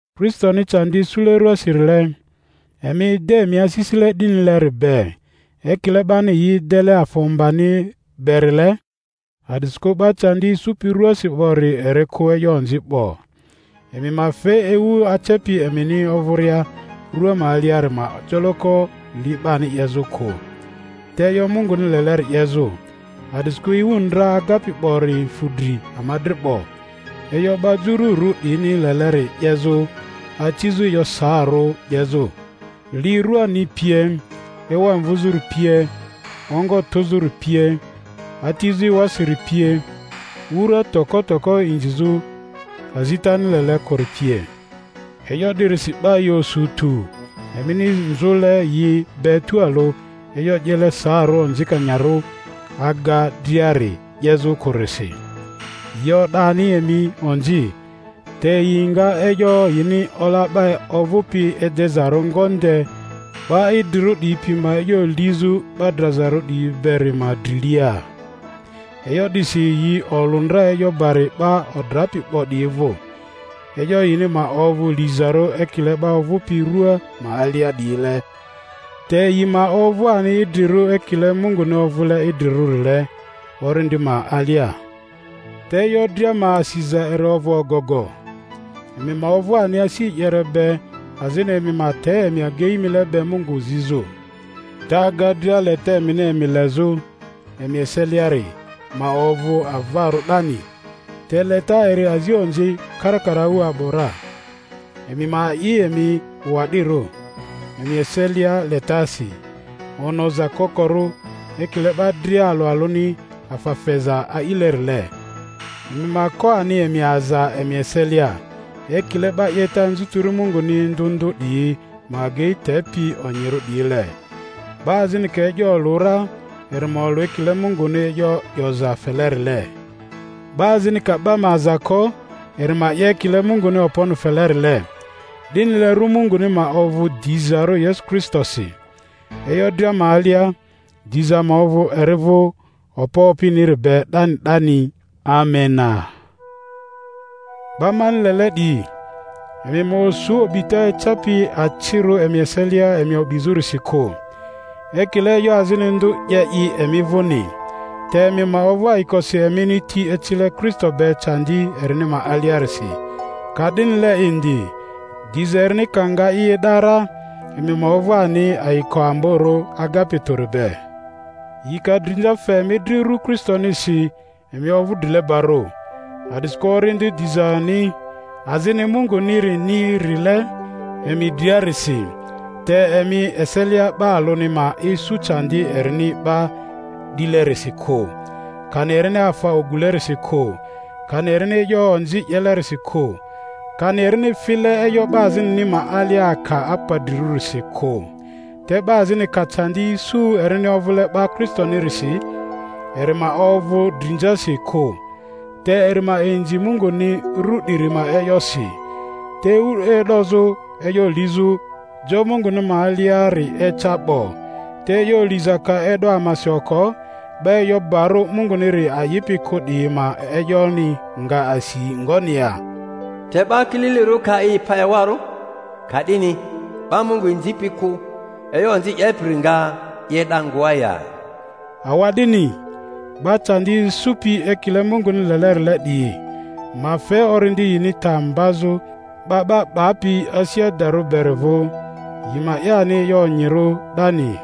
Kristoni candi isule ruasirile, emi ede emi asisile 'dinileri be, ekile 'bani yi edele afa ombani berile, a'disikᴜ 'ba candi isupi ruasi 'bori eri kᴜ e'yo onzi 'bo; emi ma fe ewu acepi emini ovᴜria rua ma aliari ma joloko li 'bani 'yezᴜ kᴜ, te e'yo Munguni leleri 'yezᴜ. A'disikᴜ ewu ndra agapi 'bori fᴜ dri ama dri 'bo e'yo 'ba jururᴜ 'diyini leleri 'yezᴜ: acizᴜ e'yo saarᴜ 'yezᴜ, li ruani pie, ewa mvᴜzᴜri pie, ongo tᴜzᴜri pie, atizᴜ ewasiri pie, wura toko toko inzizᴜ azitani lele kᴜri pie. E'yo 'dirisi 'ba yi osu tᴜ emini nzᴜle yi be tualᴜ e'yo 'yele saarᴜ onzikanyarᴜ aga driari 'yezᴜ kᴜrisi, yi o'da ani emi onzi; te yi nga e'yo yini ola 'ba ovᴜpi edezarᴜ ngonde 'ba idrirᴜ 'diyi pi ma e'yo lizᴜ 'ba drazarᴜ 'diyi beri ma drilia. E'yo 'disi yi olᴜ ndra e'yo bari 'ba odrapi 'bo 'diyi vᴜ, e'yo yini ma ovᴜ lizarᴜ ekile 'ba ovᴜpi rᴜa ma alia 'diyile, te yi ma ovᴜ ani idrirᴜ ekiie Munguni ovᴜle idrirᴜrile, orindi ma alia. Te e'yo dria ma asiza eri ovᴜ ogogo; emi ma ovᴜ ani asi e'yere be azini emi ma te emi agei mile be Mungu zizᴜ. Te aga dria, leta emini emi lezᴜ emi eseliari ma ovᴜ avarᴜ 'dani, te leta eri azi onzi karakaraᴜ a'bᴜ ra. Emi ma a'i emi wa'dirᴜ emi eselia letasi, onoza kokorᴜ. Ekile 'ba dria alᴜ alᴜni afa feza a'ilerile, emi ma ko ani emi aza emi eselia, ekile 'ba 'yeta anzutiri Munguni ndᴜ ndᴜ 'diyi ma agei tepi onyirᴜ 'diyile: 'ba azini ka e'yo olᴜ ra, eri ma olᴜ ekile Munguni e'yo 'yoza felerile; 'ba azini ka 'ba ma aza ko, eri ma 'ye ekile Munguni okponi felerile; 'dinile rᴜ Munguni ma ovᴜ dizarᴜ Yesu Kristosi e'yo dria ma alia. Diza ma ovᴜ eri vᴜ okpo opiniri be 'dani 'dani. Amena. 'Ba mani lele 'diyi, emi ma osu o'bita ecapi acirᴜ emi eselia emi o'bizᴜrisi kᴜ, ekile e'yo azini ndᴜ 'ye i emi vᴜni. Te emi ma ovᴜ ayikosi emini ti ecile Kristo be candi erini ma aliarisi, ka'dinile indi diza erini ka nga i e'da ra emi ma ovᴜ ani ayiko amborᴜ agapi tᴜri be. Yi ka drinza fe emi dri ru Kristonisi, emi ovᴜ drilebarᴜ, a'disikᴜ Orindi dizani azini Mungunirini rile emi driarisi. Te emi eselia 'ba alᴜni ma isu candi erini 'ba 'dilerisi kᴜ, kani erini afa ogulerisi kᴜ, kani erini e'yo onzi 'yelerisi kᴜ, kani erini file e'yo 'ba azinini ma alia aka apadrirᴜsi kᴜ; te 'ba azini ka candi isu erini ovᴜle 'ba Kristonirisi, eri ma ovᴜ drinzasi kᴜ, te eri ma inzi Munguni ru 'diri ma e'yosi. Te ewu e'dozᴜ e'yo lizᴜ jo Munguni ma aliari eca 'bo; te e'yo liza ka e'do amasi oko, 'ba e'yo barᴜ Munguniri a'ipi kᴜ 'diyi ma e'yoni nga asi ngoni ya? Te 'Ba kililirᴜ ka i pa ewarᴜ, ka'dini 'ba Mungu inzipi kᴜ, e'yo onzi 'yepiri nga i e'da ngoa ya? Awa'dini, 'ba candi isupi ekile Munguni lelerile 'diyi ma fe orindi yini ta mbazᴜ 'Ba 'ba 'Bapi asi adarᴜ beri vᴜ, yi ma 'ye ani e'yo onyirᴜ 'dani.